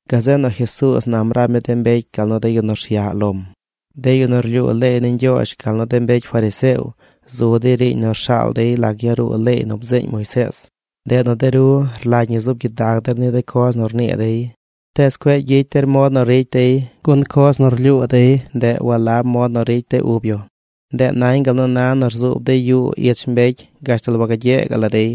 Gazeꞌ nu Jesuuz nam rab mi de mbecy gal nu de yu nu rsyaꞌ lom: ―De yu nu rlyuu leey ni Ñgyoozh gal nu de mbecy fariseo zu dey riiñ nu rshaal dey lac yaruu leey nu bzeeñ Moisees. Ndeꞌ nu de ru rlagy ñi zuub gyidag der ni de coz nu rnii dey, tees cueꞌ gyicy der mod nu ricy dey, gun coz nu rlyuu dey, ndeꞌ walab mod nu ricy de ub yu. Ndeꞌ nañ gal nu na nu rzuub dey yuu ich mbecy gashtal wagagyee gaꞌ la dey.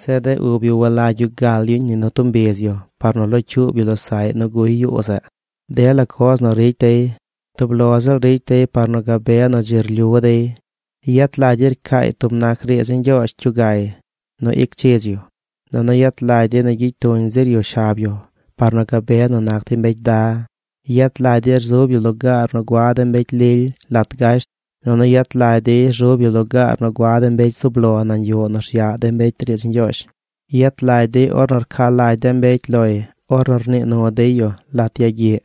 Zeꞌ de ub yu walagy yu gal yuñ ni nu tub mbiz yu par nu locyuub yu losaꞌy nu guy yuu zeꞌ. Dela coz nu ricy dey, tub lo ziꞌl ricy dey par nu gabe nu dzi rlyu dey. Yet lagy dey rcaay tub nac riidz ni Ñgyoozh cyugay nu ic chidz yu, nunu yet lagy dey gyicy tuñ zir yu shab yu par nu gabe nu nac dey mbecy da. Yet lagy dey rzub yu lugaar nu gua de mbecy lily lat gasht, nunu yet lagy dey rzub yu lugaar nu gua de mbecy zub lo nañ yuꞌ nu rsyaꞌ de mbecy riidz ni Ñgyoozh. Yet lagy dey ornu rca lagy de mbecy loy ornu rnii nu dey yu lat yagyiꞌ.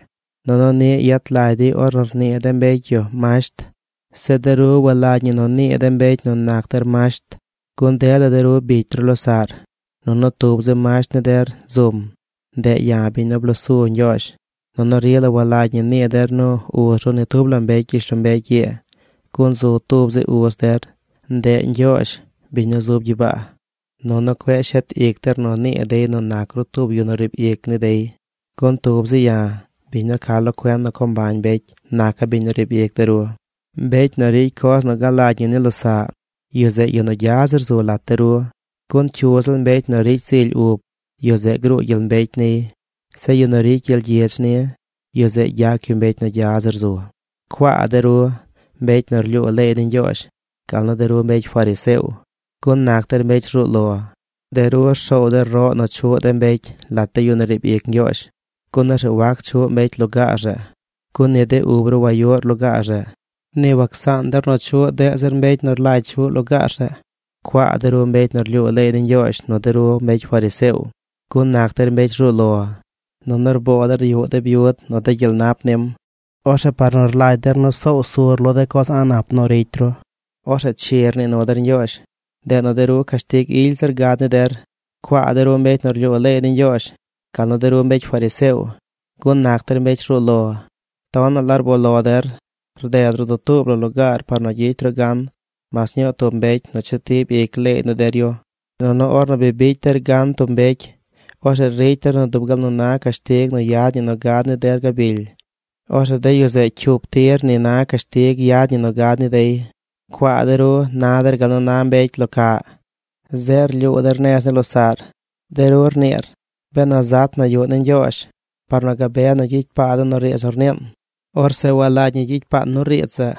Nunu niꞌ yet lagy dey ornu rnii de mbecy yu masht. ’Zeꞌ de ru walagy ñi nu nii de mbecy nu nac der masht, gun dela de ru bicy ru losaꞌr nunu tub zi masht ni der zum. Ndeꞌ ya̱ biñ nu blosu Ñgyoozh. Nunu rila walagy ñi nii der nu uz ru ni tub la mbecy gyishlombecy ii, gun zu tub zi uz der. Ndeꞌ Ñgyoozh, biñ nu zub gyibaa. Nunu cueꞌ shet ic der nu nii dey nu nac ru tub yu nu riib ic ni dey, gun tub zi ya̱, biñ nu ca lo cuen nu co mbañ mbecy naca̱ biñ riib ic de ru. Mbecy nu ricy coz nu galagy ñi ni losaꞌ, yu zeꞌ yu nu gya zir zu lat de ru. Gun cyu ziꞌl mbecy nu ricy zily ub, yu zeꞌ gruu gyel mbecy niy. Zeꞌ yu nu ricy gyel gyidz ni, yu zeꞌ gyac yu mbecy nu gya zir zu. ’¡Cuaa de ru, mbecy nu rlyuu leey ni Ñgyoozh, gal nu de ru mbecy fariseo, gun nac der mbecy rzuu lo! De ru rsoow der roꞌ nu chuꞌ de mbecy lat de yu nu riib ic Ñgyoozh, gun orzeꞌ wac chuꞌ mbecy lugaar zeꞌ. Gun ni de ub ru wayuꞌr lugaar zeꞌ, ni wacsaan der nu chuꞌ deꞌ zir mbecy nu rlagy chuꞌ lugaar zeꞌ. ’¡Cuaa de ru mbecy nu rlyuu leey ni Ñgyoozh nu de ru mbecy fariseo, gun nac der mbecy rzuu lo! Nunu rboo der yuꞌ de byud nu de gyel nap nim. Orzeꞌ par nu rlagy der nu soow sur lo de coz a̱ꞌ nap nu ricy ru, orzeꞌ chi rnii nu der Ñgyoozh. Ndeꞌ nu de ru cashtig ily zir gad ni der. ’¡Cuaa de ru mbecy nu rlyuu leey ni Ñgyoozh gal nu de ru mbecy fariseo, gun nac der mbecy rzuu lo! Tonaꞌ la rboo lo der rded ru dutuub la lugaar par nu gyicy ru gan mas ñuu tub mbecy nu chetib ic leey ni der yu. Nunu ornu bi bicy der gan tub mbecy, orzeꞌ ricy der nu dub gal nu na cashtig nu yad ñi nu gad ni der gabily, orzeꞌ de yu zeꞌ cyup tir ni na cashtig yad ñi nu gad ni dey. ’¡Cuaa de ru! Na der gal nu na mbecy lo caꞌ. Zeꞌ rlyuu der nez ni losaꞌr. De ru rniir: “Benu zat na yuꞌ ni Ñgyoozh par nu gabe nu gyicy paa den nu riidz nu rniin, orzeꞌ walagy ñi gyicy paan nu riidz zeꞌ.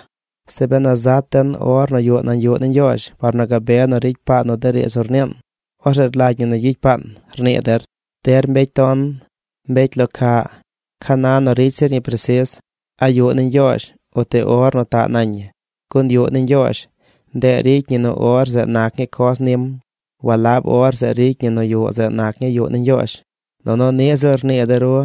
Zeꞌ benu zat den or nu yuꞌ nañ yuꞌ ni Ñgyoozh par nu gabe nu ricy paan nu riidz nu rniin, orzeꞌ rlagy ñi gyicy paan”, rnii der. ¡Der mbecy ton! ¡Mbecy lo caꞌ! ¿Ca na nu ricy zir ñi presis: a yuꞌ ni Ñgyoozh uti or nu taꞌ nañ ñi? Gun yuꞌ ni Ñgyoozh, ndeꞌ ricy ñi nu or zeꞌ nac ñii coz nim. Walab or zeꞌ ricy ñi nu yuꞌ zeꞌ nac ñii yuꞌ ni Ñgyoozh. Nunu niꞌ ziꞌl rnii de ru: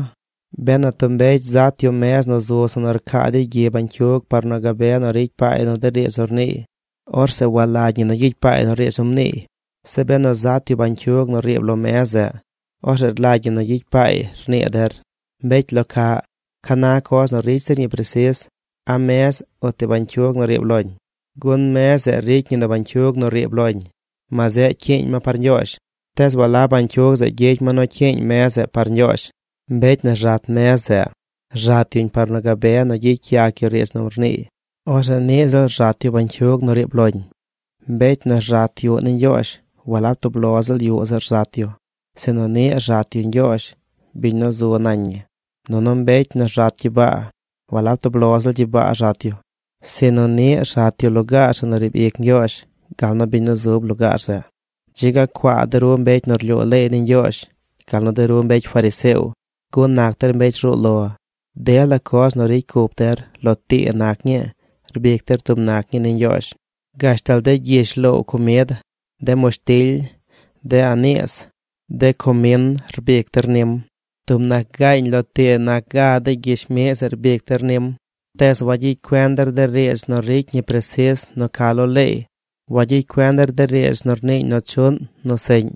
“Benu tub mbecy zat yu mez nu zu zeꞌ nu rcaa dey gyi bañcyug par nu gabe nu ricy paay nu riidz nu rniiy, orzeꞌ walagy ñi gyicy paay nu riidz nu mniiy. Zeꞌ benu zat yu bañcyug nu riib lo mez zeꞌ, orzeꞌ rlagy ñi nu gyicy paay”, rnii der. ¡Mbecy lo caꞌ! ¿Ca na coz ricy zir ñi presis: a mez uti bañcyug nu riib loñ? Gun mez zeꞌ ricy ñi nu bañcyug nu riib loñ, ma zeꞌ cyiiñ ma par Ñgyoozh. Tees walab bañcyug zeꞌ gyicy ma nu cyiiñ mez zeꞌ par Ñgyoozh. Mbecy nu rzat mez zeꞌ rzat yuñ par nu gabe nu gyicy yac yu riidz nu rniiy. Orzeꞌ niꞌ ziꞌl rzat yu bañcyug nu riib loñ. Mbecy nu rzat yuꞌ ni Ñgyoozh, walab tub lo ziꞌl yuꞌ zeꞌ rzat yu, sinu niꞌ rzat yu Ñgyoozh, biñ nu zu nañ ñi. Nunu mbecy nu rzat gyibaa walab tub lo ziꞌl gyibaa rzat yu, sinu niꞌ rzat yu lugaar zeꞌ nu riib ic Ñgyoozh, gal nu biñ nu zub lugaar zeꞌ. ’¡Dzi ga cuaa de ru mbecy nu rlyuu leey ni Ñgyoozh gal nu de ru mbecy fariseo gun nac der mbecy rzuu lo! Dela coz nu ricy cup der, lo tii nac ñii, rbic der tub nac ñii ni Ñgyoozh: gashtal de gyish loow comid, de mushtily, de aniis, de comin rbic der nim. Tub nac gaañ lo tii nac ga de gyish miꞌ zeꞌ rbic der nim. Tees wagyicy cuen der de riidz nu ricy ñi presis nu ca lo leey. Wagyicy cuen der de riidz nu rniiñ nu chuꞌn nu seꞌñ.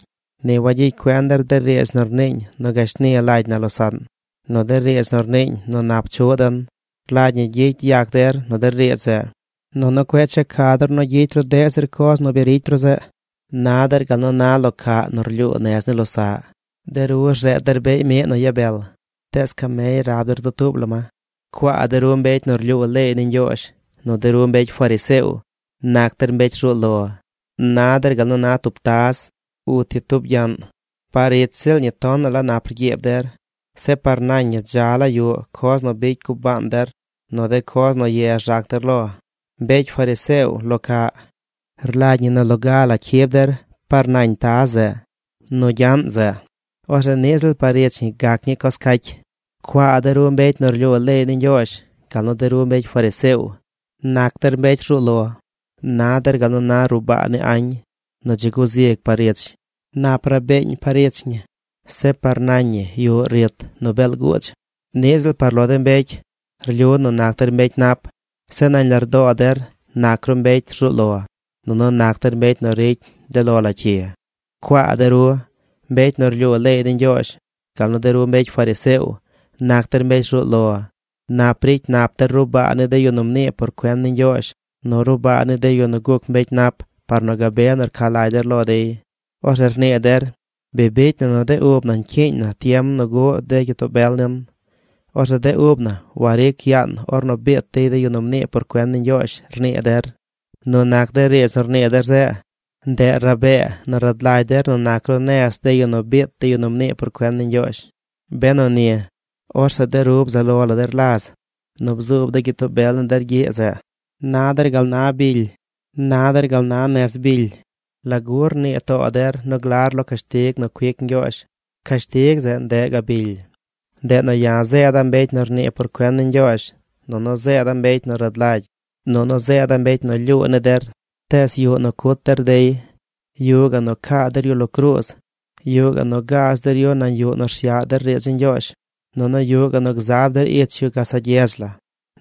Ni wagyicy cuen der de riidz nu rniiñ nu gashni lagy na losaꞌn, nu de riidz nu rniiñ nu nap chuꞌ den. Rlagy ñi gyicy yac der nu de riidz zeꞌ, nunu cueꞌ checa der nu gyicy ru deꞌ zir coz nu bi ricy ru zeꞌ. Na der gal nu na lo caꞌ nu rlyuu nez ni losaꞌ. De ru rzeed der beꞌy miꞌ nu ibel tees camey rab der dutuub la ma. ’¡Cuaa de ru mbecy nu rlyuu leey ni Ñgyoozh nu de ru mbecy fariseo! ¡Nac der mbecy rzuu lo! Na der gal na tub taz uti tub gyaꞌn. Par ich ziꞌl ñi tonaꞌ la nap rgyiib der. Zeꞌ par nañ ñi dza la yuꞌ coz nu bicy gubaan der, nu de coz nu ye rzac der lo. ¡Mbecy fariseo lo caꞌ! Rlagy ñi nu loga la cyib der par nañ taz zeꞌ, nu gyaꞌn zeꞌ. Orzeꞌ niꞌ ziꞌl par ich ñi gac ñii coz caacy. ’¡Cuaa de ru mbecy nu rlyuu leey ni Ñgyoozh gal nu de ru mbecy fariseo! ¡Nac der mbecy rzuu lo! Na der gal nu na ruꞌ baa ni añ nu dzi guzig par ich. Nap rabeeñ par ich ñi. Zeꞌ par nañ ñi yuꞌ rit nu beel guudz. Niꞌ ziꞌl par lo de mbecy, rlyu nu nac der mbecy nap, zeꞌ nañ lardoo der nac ru mbecy rzuu lo, nunu nac der mbecy nu ricy de lo la cyi. ’¡Cuaa de ru, mbecy nu rlyuu leey ni Ñgyoozh gal nu de ru mbecy fariseo! ¡Nac der mbecy rzuu lo! Nap ricy nap der ruꞌ baa ni de yu nu mnii por cuen ni Ñgyoozh, nu ruꞌ baa ni de yu nu guc mbecy nap par nu gabe nu rca lagy der lo dey. Orzeꞌ rnii der: “Bi bicy na nu de ub na ñcyiiñ na tiem nu guꞌ de gyitoo bel nin, orzeꞌ de ub na waric yaan ornu biit dey de yu nu mnii por cuen ni Ñgyoozh”, rnii der. Nu nac de riidz nu rnii der zeꞌ, ndeꞌ rabee nu rad lagy der nu nac ru nez de yu nu biit de yu nu mnii por cuen ni Ñgyoozh. Benu ni, orzeꞌ de ru bzaꞌ lo la der laz nu bzuub de gyitoo bel ni der gyiꞌ zeꞌ. ’Na der gal na bily. Na der gal na nez bily. ¿Lagu rnii too der nu glar lo cashtig nu cuic Ñgyoozh? Cashtig zeꞌ, ndeꞌ gabily. Ndeꞌ nu ya̱ zeeda̱ mbecy nu nii por cuen ni Ñgyoozh, nunu zeeda̱ mbecy nu rad lagy, nunu zeeda̱ mbecy nu lyuu ni der. Tees yuꞌ nu cut der dey. Yuꞌ gaꞌ nu caa der yu lo cruuz. Yuꞌ gaꞌ nu gaaz der yu nañ yuꞌ nu rsyaꞌ der riidz ni Ñgyoozh. Nunu yuꞌ gaꞌ nu gzab der ich yu gazaꞌ gyedz la.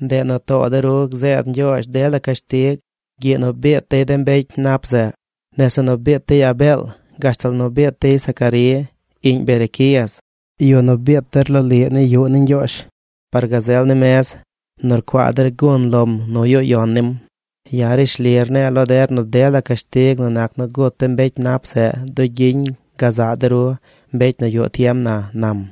Ndeꞌ nu too de ru gzeed Ñgyoozh dela cashtig gyiꞌ nu biit dey de mbecy nap zeꞌ: nese nu biit dey Abeel gashtal nu biit dey Zacarí, iꞌñ Berequías, yu nu biit der loliꞌ ni yuꞌ ni Ñgyoozh par gazel ni mez nu rcuaa der gun lom nu yuꞌ yon nim. Ya̱ rishli rne̱e̱ lo der nu dela cashtig nu nac nu gut de mbecy nap zeꞌ dugyiñ gazaꞌ de ru, mbecy nu yuꞌ tiem na ―nam―.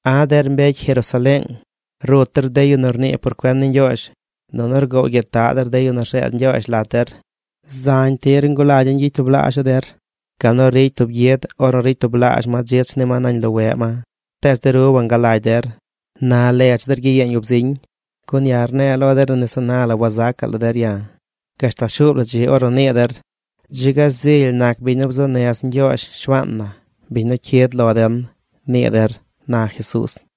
’¡A̱ der mbecy Jerusaleeng! Rut der de yu nu rnii por cuen ni Ñgyoozh. Nunu rgoow gyitaꞌ der de yu nu rzeed Ñgyoozh lat der. Zañ tir ngulagya̱ ñgyicy tublaazha̱ der gal nu ricy tub gyid ornu ricy tublaazh ma dzich ni ma nañ loweꞌ ma. Tees de ru wangalagy der. Na ledz der gyiyeeñ ub ziñ. Gun ya̱ rne̱e̱ lo der nu nese na la wazacaꞌ la der ya̱ gashtal shuub la dzi ornu nii der: “Dzi ga zily nac biñ nu bzuu nez Ñgyoozh, Shuaan na, biñ nu cyid lo den”, nii der ―na Jesuuz.